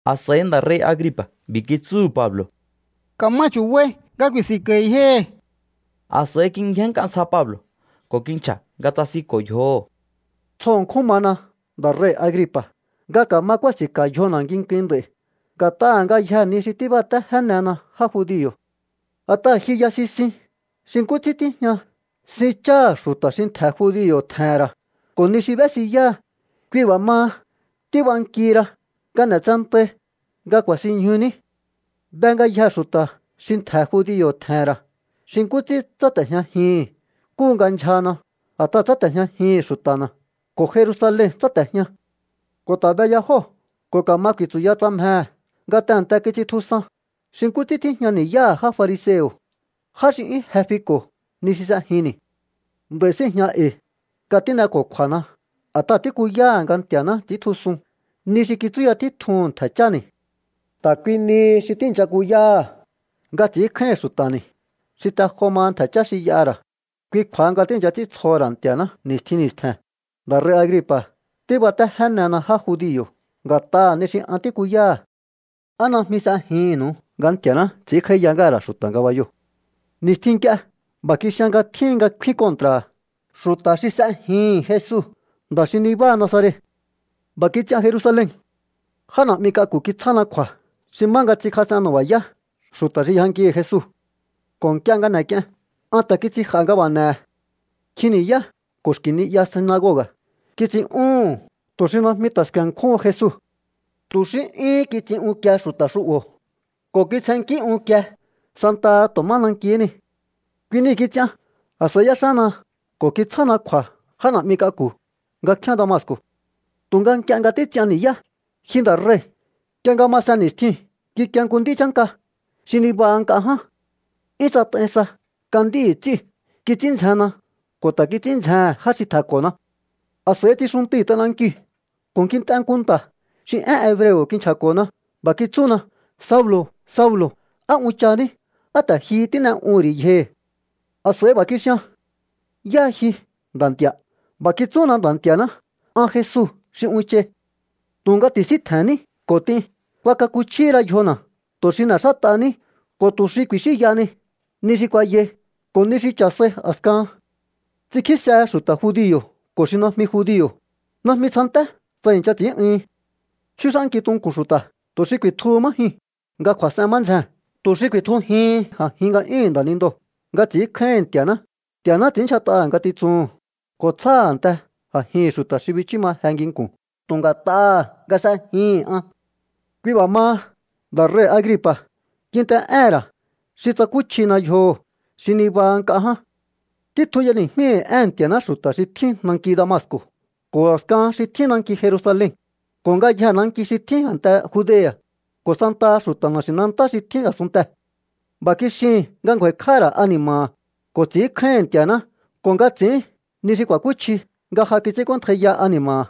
A̱s'a̱i nda̱ rei̱ Agripa̱ b'i̱ kitsúhu̱ Pablo̱: —Ka̱ma chu̱bai nga ku̱i̱si̱nko̱i̱ yjohi̱. A̱s'a̱i kingjénnk'a ntsja Pablo̱ ko̱ kinchja̱ nga tsasinko̱ yjoho̱: —Tsjo ṉkjún mana, nda̱ rei̱ Agripa̱, nga ka̱ma kúási̱nka̱ yjona̱ nginkuin nd'a̱i̱ nga̱t'aha̱ ngayjee̱ ni xi tíbatéjénena já judio̱. A̱t'aha̱ ji ya sisin xi nkú ts'ín tíjña sin cháha̱ xu̱ta̱ xi ntje̱ judio̱ tje̱he̱n ra̱ ko̱ ni xi b'ésiyáha. Kui b'a̱ maha, tíbankihi ra nga n'e̱tsentai nga ku̱a̱sinñjuní. ’Be ngayjee̱ xu̱ta̱ xi ntje̱ judio̱ tje̱he̱n ra̱ xi nkú ts'ín tsáte̱jñajihi̱n nkúhu nga ndyjana. A̱t'aha̱ tsáte̱jñajihi̱n xu̱ta̱na̱ ko̱ Jerusalen tsáte̱jña. Ko̱ ta̱ be ya jóo̱ ko̱ ka̱ma ku̱i̱tsu̱ya tsa mjehe̱, nga tehe̱nte kits'intjusan xi nkú ts'ín tíjña ni̱yáha̱ já fariseo̱, já xi 'yún je fiko̱ ni xi s'ejinni̱. ’Nd'a̱i̱ síi̱jña e̱i̱ nga tín'eko̱kju̱a̱na a̱t'aha̱ tíkuyáha̱ nga Nti̱a̱ná ts'i̱íntjusun ni xi kitsúya títjuhu̱n ntje̱ cháni̱. Ta̱ kui nihi xi tíi̱ncha kuyáha̱ nga ts'i̱ínkjáíhi̱n xu̱ta̱ni̱ xi te jo maha ntje̱ chá xi y'aha̱ ra̱. Kui kju̱a̱ha nga tíi̱ncha ts'íntsjoho̱ ra̱ Nti̱a̱ná ni̱stjin ni̱stje̱n. Nda̱ rei̱ Agripa̱, tíbatéjénena já judio̱ nga̱t'aha̱ ni xi an tíkuyáha̱. ¿Á najmi s'ejihi̱nnu̱u nga Nti̱a̱ná ts'i̱ínkj'áíya ngáha̱ ra̱ xu̱ta̱ ngabayoo̱? ’Ni̱stjin nk'ie b'a̱ kixian nga tjíhin nga kfín kontra̱ha̱ xu̱ta̱ xi s'ejihi̱n Jesu, nda̱ xi nabáha Nazaret. B'a̱ kits'ian Jerusalen. Já na̱'mi k'aku̱ kitsjána kju̱a̱ xi má nga ts'inkjas'en nu̱ba̱yá xu̱ta̱ xi yjankihi̱ Jesu. Ko̱ nk'ie nga n'ek'ien, an ta̱ kits'inj'a̱ nga b'a̱ n'ehe̱. Nkjin ni̱yá ko̱ xki̱ ni'ya sinagoga̱ kits'in'úhu̱n tu̱ xi najmi ta̱ sku̱e̱nkjúhun Jesu. Tu̱ xí 'yúhún kits'in unkie xu̱ta̱ xu'bo̱ ko̱ kitsjennkí unkie santaha tu̱ má nankihí ni. ’Kui nii̱ kits'ian. A̱s'a̱i y'éxána ko̱ kitsjána kju̱a̱ já na̱'mi k'aku̱ nga kfíán Damasco̱. Tu̱nga nk'ie nga títs'ian ni̱yá, ji nda̱ rei̱, nk'ie nga masen ni̱stjiu̱n kikie nku nd'í chánka xi nibaha nk'a ján. 'Yún tsat'ai sa nga nd'íhi̱ ts'íu̱. Kits'ín ndzjenna ko̱ ta̱ kits'ín ndzjehe̱n já xi tje̱nko̱na. A̱s'a̱i tsixuntui̱ t'anankiu̱ ko̱ kint'e nku nta̱ xi én hebreo̱ kinchja̱ko̱na. B'a̱ kitsúna: “Saulo̱, Saulo̱, ¿á unchahaní? ¿Á ta̱ ji tín'e'uhu̱n ri̱ yjohi̱?” ’A̱s'a̱i b'a̱ kixian: “¿Yáha ji, Nda̱ Nti̱a̱?” B'a̱ kitsúna Nda̱ Nti̱a̱ná: “An Jesu xi unchai. Tu̱nga ti̱síntje̱nní ko̱ t'in. Kuakakuchjíhi ra yjona̱ tu̱ xi n'e̱xát'ahaní ko̱ tu̱ xi ku̱i̱xínyahani ni xi kuayai ko̱ ni xi cha̱ sai a̱skahan. Ts'inkjísehe xu̱ta̱ judio̱ ko̱ xi najmi judio̱. Najmi tsjanté tsa i̱ncha ts'i̱ín'uhin. Chjúx'ánki tunku̱n xu̱ta̱ tu̱ xi ku̱i̱tjuhu má jyuu̱n nga kju̱a̱s'ehen má ndzjee̱n, tu̱ xi ku̱i̱tjujihin a̱jin nga'yúhu̱n nda̱nindoo̱ nga ts'i̱ínkjáíhi̱n Nti̱a̱ná. Nti̱a̱ná ts'i̱ínndyjat'aha̱ ngatitsuhu̱n ko̱ tsjáha̱ a̱nte a̱jihi̱n xu̱ta̱ xi bichú ma je nginku̱n tu̱ nga̱t'aha̱ nga s'ejihi̱n an.” ’Kui b'a̱ maha, nda̱ rei̱ Agripa̱, kint'e'éhe̱n ra̱ xi tsakúchjina yjoho̱, xi nibaha nk'a ján. Títjun y'eni̱jmíhi̱ éhe̱n Nti̱a̱ná xu̱ta̱ xi tjín nanki Damasco̱, ko̱ a̱skahan xi tjín nanki Jerusalen ko̱ ngayjee̱ nanki xi tjín a̱nte Judea̱, ko̱ santaha xu̱ta̱ na̱xi̱nantá xi tjín a̱sunntee̱. B'a̱ kixihi̱n nga ngju̱a̱i̱kj'áha̱ ra̱ ani̱ma̱ha̱ ko̱ ts'i̱ínkjáíhi̱n Nti̱a̱ná, ko̱ nga ts'i̱ín ni xi ku̱a̱kúchji nga ja kits'ínk'óntjaiya ani̱ma̱ha̱.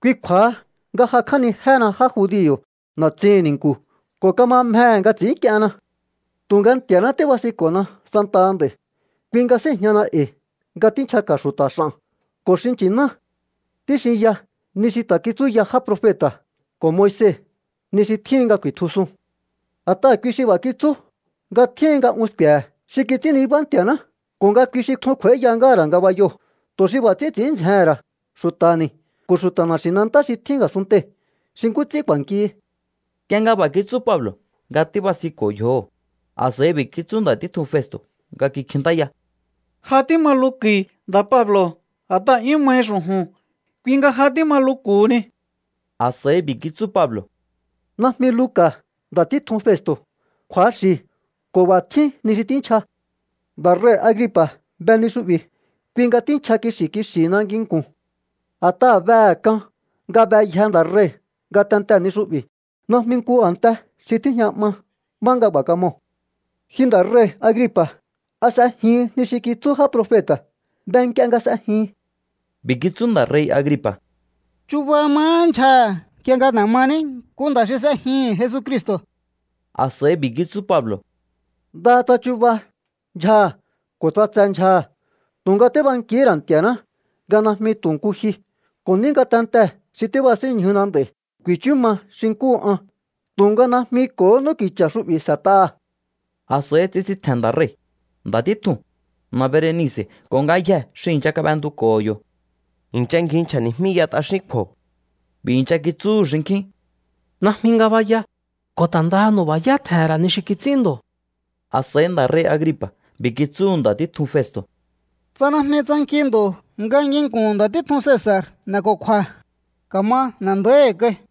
Kui kju̱a̱ha nga jakj'ánijéhena já judio̱ na̱tsihi̱n ni̱nku̱ ko̱ kama mjehe̱ nga ts'i̱ínk'ienna. ’Tu̱nga Nti̱a̱náhá tíbasinko̱na santaha nd'a̱i̱. Kui nga síi̱jñahana e̱i̱ nga tínchjaka̱ xu̱ta̱ x'a̱n ko̱ xi nchi̱ná. Tíxinya ni xi ta̱ kitsúya já profeta̱ ko̱ Moise, ni xi tjíhin nga ku̱i̱tjusun. A̱t'aha̱ kui xi b'a̱ kitsú nga tjíhin nga un sku̱e̱he̱ xi kits'ín nibá Nti̱a̱ná ko̱ nga kui xi tjun kj'u̱a̱íya ngáha̱ ra̱ ngabayoo̱, tu̱ xi b'a̱ ts'ín ts'i̱ín ndzjehe̱n ra̱ xu̱ta̱ni̱ ko̱ xu̱ta̱ na̱xi̱nantá xi tjín a̱sunntei̱ xi nkú ts'ín k'u̱a̱nkihi. Nk'ie nga b'a̱ kitsú Pablo̱ nga tíbasinko̱ yjoho̱, a̱s'a̱i b'i̱ kitsú nda̱ títjun Festo̱ nga kikjintáya: —¡Ja tíma luku̱i̱, nda̱ Pablo̱! A̱t'aha̱ 'yún mahi xu̱ju̱n, kui nga ja tíma luku̱huni. A̱s'a̱i b'i̱ kitsú Pablo̱: —Najmi luka̱, nda̱ títjun Festo̱. Kju̱axi̱ ko̱ b'a̱ tjín ni xi tínchja. Nda̱ rei̱ Agripa̱ be ni xu'bi̱. Kui nga tínchja kixi̱ kixi̱hina nginku̱n. A̱t'aha̱ behe̱ k'an nga beyje nda̱ rei̱ ngatentee̱ ni xu'bi̱. Najmi nku a̱nte xi tíjña 'ma má nga b'a̱ kamoo̱. Ji nda̱ rei̱ Agripa̱, ¿a s'ejihin ni xi kitsú já profeta̱? Be nk'ie nga s'ejihin. B'i̱ kitsú nda̱ rei̱ Agripa̱: —Chuba mahá ndyjaha̱ nk'ie nga n'e̱ maní nku nda̱ xi s'ejihi̱n Jesucristo̱. A̱s'a̱i b'i̱ kitsú Pablo̱: —Ndaha tsa chuba ndyjaha̱ ko̱ tsa tse ndyjaha̱, tu̱nga tíbankihí ra̱ Nti̱a̱ná nga najmi tu̱ nku ji, ko̱ ní ngatentee̱ xi tíbasínñjuna nd'a̱i̱ ku̱i̱chú ma xi nkúhu an, tu̱nga najmi ko̱hó n'úki̱cha̱ xu'bi̱ s'e̱t'aha̱. A̱s'a̱i tsisintje̱n nda̱ rei̱, nda̱ títjuu̱n, na̱ Berenice̱ ko̱ ngayjee̱ xi i̱ncha kab'entuko̱ho̱ yo̱. I̱ncha ngji nchja̱ni̱jmíya t'axín kju̱o̱. B'i̱ i̱ncha kitsúhu̱ xinkjín: —Najmi ngabaya ko̱ ta̱ ndaha nu̱ba̱yá tje̱he̱n ra̱ ni xi kits'ín ndo̱. A̱s'a̱i nda̱ rei̱ Agripa̱ b'i̱ kitsúhu̱ nda̱ títjun Festo̱: —Tsa najmi tsanki ndo̱ nga nginku̱n nda̱ títjun k'aku̱ Cesa̱r n'e̱ko̱kju̱a̱, ka̱ma n'e̱ nda̱íhi̱ kai.